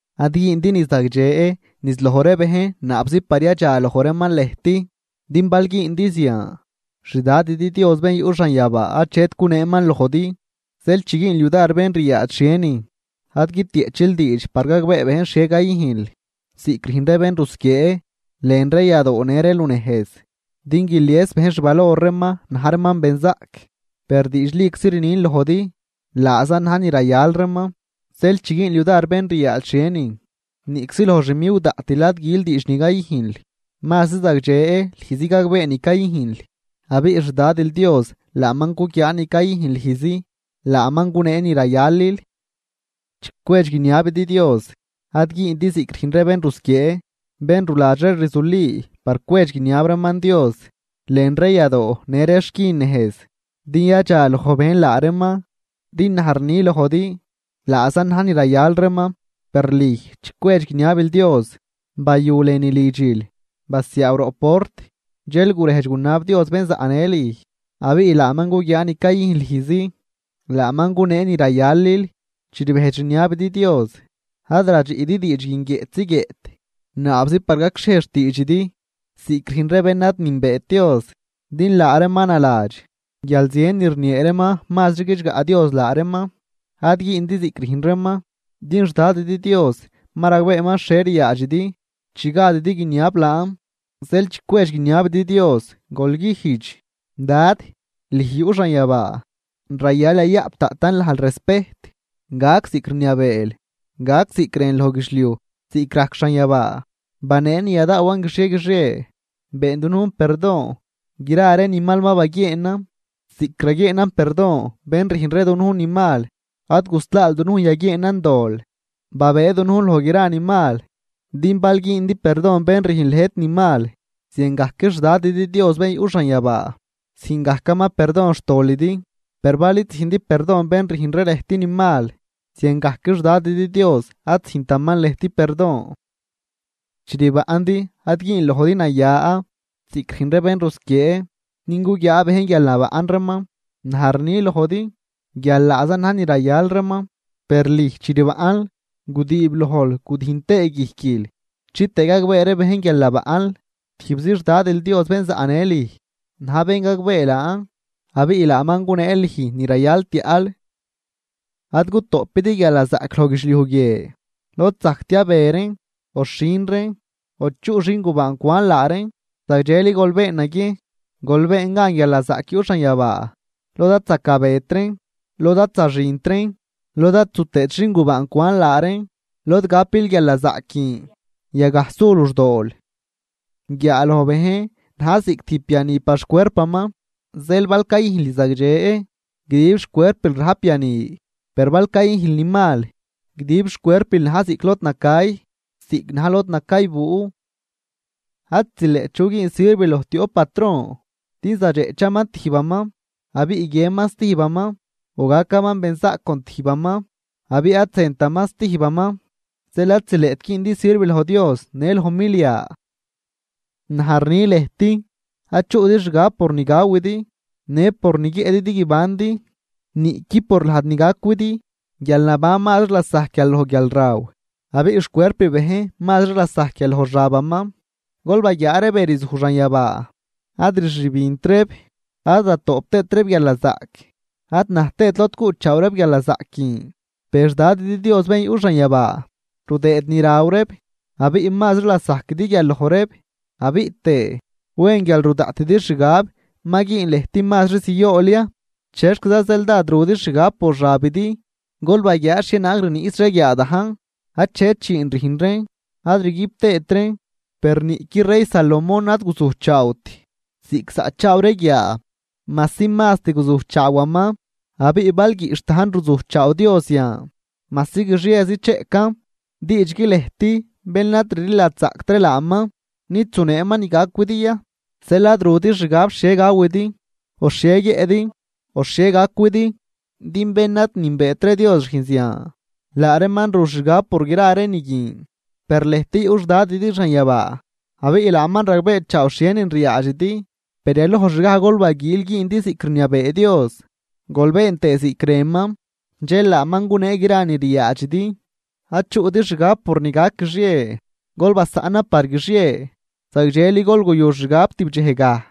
’Ad güündi ni zagdxe niz loj ree bejn naabzi par yadxaloj reeman lëjt. Din bal güündi zian, xDadidi Dios bén yuꞌ xanyabaa achet guneeman lojdi. Zeel chi güünl yudar bén ryaadx xhienin, ad guitieꞌchil diidx par gagbee bejn xhie cayüjnl ziꞌc rüjn ree bén rusquiee, lën ree yadoo në ree lunejz, din guilies bejn xvalor reeman na̱j reeman benzaꞌc. Per diidxliczi rnin lojdi, laazan na̱j ni rayal reeman. Zeel chi güünl yudar bén ryaadx xhienin, niꞌczi loj xmiwdaꞌtil ad gül diidx ni cayüjnl. Mazri zagdxe lüjzi gagbee ni cayüjnl, abiꞌ xDadil Dios laaman cuguiaa ni cayüjn lüjzi, laaman gunee ni rayalil. ’Chi cwedx guiniabidi Dios, ad güündi ziꞌc rüjn ree bén rusquiee, bén ruladx ree rzuli par cwedx guiniab reeman Dios lën ree yadoo në ree xquin nejz, din yadxaloj bejn laa reeman. Din naj rni lojdi, laazan na̱j ni rayal reeman. Per lüj chi cwedx guiniabil Dios, bayu lënü lidxil, basiaaw roꞌ port, dxel gurejdx gunab Dios bén zaꞌnë lüj. Abiꞌ laaman cuguiaa ni cayüjn lüjzi, laaman gunee ni rayalil. ’Chi rbejdx rniabidi Dios, ad radxiꞌdi diidx guin guiëꞌtzi guiëꞌt naabzi par gacxhiej xtiidxidi, ziꞌc rüjn ree bén ad nünbeet Dios. Din laa reeman naladx guial zien ni rniee reeman mazri guidxgaꞌ Dios laa reeman. Ad güündi ziꞌc rüjn reeman, din xDadidi Dios ma ragbeeman xhie ryaadxidi chi gadidi guiniab laan. Zeel chi cwedx guiniabidi Dios, gol güjdx: Dad, lüj yuꞌ xanyabaa, rayal yayaꞌp daꞌtan lajl respejt. Gac ziꞌc rniabeel. Gac ziꞌc rënl loj guidxliuj ziꞌc rajc xanyabaa. Banee ni yadaawan guixie guixie. Been dunujn perdon gra ree ni mal ma baguieenan ziꞌc raguieenan perdon bén rüjn ree dunujn ni mal. Ad guslaal dunujn yaguieenan dol, babëë dunujn loj gra ni mal. ’Din bal güündi perdon bén rüjn lëjt ni mal, ziangajc xDadidi Dios bén yuꞌ xanyabaa züjn gajcaman perdon xtolidi. Per bal id züjndi perdon bén rüjn ree lëjt ni mal, ziangajc xDadidi Dios ad züjntaman lëjt perdon. ’Chi rbaꞌndi ad güün lojdi naya, ziꞌc rüjn ree bén rusquiee din guguiaa bejn guial nabaꞌn reeman. Naj rni lojdi, guial laazan na̱j ni rayal reeman. Per lüj, chi rbaꞌnl, gudiib lojl gudüjn tëë guijquil chitëë gagbee ree bejn guial nabaꞌnl. Tijbzi xDadil Dios bén zaꞌnë lüj na̱j bén gagbee laan, abiꞌ laaman gunee lüj ni rayal tiaꞌl. ’Ad gutoꞌpidi guialnazaꞌc loj guidxliuj guie lod zajc tiabe reen o xhin reen o chuꞌ xingubaan cwan laa reen. Zagdxeli gol been naguiejn gol been gan guialnazaꞌc yuꞌ xanyabaa lod ad zacabet reen, lod ad zaxint reen, lod ad zu tëët xingubaan cwan laa reen. Lod gapil guialnazaꞌc guin yagaj su luxdool. ’Guiaaloj bejn na̱j ziꞌc tijb biani par xcuerpaman. Zeel bal cayüjnl ni zagdxe, guidib xcuerpil rajp biani. Per bal cayüjnl ni mal, guidib xcuerpil na̱j ziꞌc lod nacay, ziꞌc na̱j lod nacaybuu. ’Ad zileꞌt chu güün sirv loj tioꞌp patron, din zadxeꞌchaman tijbaman abiꞌ guiënman stijbaman, o gacaman benzaꞌc con tijbaman abiꞌ ad zëntaman stijbaman. Zeel ad zileꞌt güündi sirv loj Dios në loj milia. ’Naj rni lëjt: Ad chuꞌdi xgab por ni gawidi në por ni guiëꞌdi din guibandi, niꞌqui por lajd ni gacwidi. Guialnaban mazri lasajc guial loj guialraw, abiꞌ xcuerp bejn mazri lasajc guial loj xabaman. Gol baguiaa ree be rzuj xanyabaa, ad rxübint reeb, ad ratoꞌp tëët reeb guialnazaꞌc, ad na̱j tëët lod cuꞌchaaw reeb guialnazaꞌc guin. Per xDadidi Dios bén yuꞌ xanyabaa rudëëd ni raw reeb. Abiꞌ mazri lasajquidi guial loj reeb. Abiꞌ tëë, ¿wen guial ru daꞌtidi xgab ma güün lëjt mazri ziool ya? ’¿Chexquiza zeel dád rudi xgab por xabidi? Gol baguiaa xhienaag rniꞌs ree guiaa dajn. Achet dxiin rüjn reen ad rguib tëët reen, per niꞌqui rey Salomón ad guzujchaawt ziꞌc zaꞌchaaw ree guiaa majsi mast guzujchaawaman. Abiꞌ bal guiꞌxh dajn ruzujchaaw Dios yan, majsi guixiezi cheꞌcan. Diidxgui lëjt bén ad rliladxzaꞌct ree laaman, nid zuneeman ni gacwidi ya. Zeel ad rudi xgab xhie gawidi, o xhie guiëꞌdi, o xhie gacwidi. Din bén ad nünbeet ree Dios rüjn zian, laa reeman ru xgab por gra ree ni guin. Per lëjt yuꞌ xDadidi xanyabaa, abiꞌ laaman ragbeechaaw xhienin ryaadxidi. Per yalojxgaj gol baguiil güündi ziꞌc rniabee Dios, gol been tëë ziꞌc rënman, dxel laaman gunee gra ree ni ryaadxidi. Ad chuꞌdi xgab por ni gac guixie, gol basaꞌnan par guixie, zagdxeli gol guyu xgab tib dxejgaj.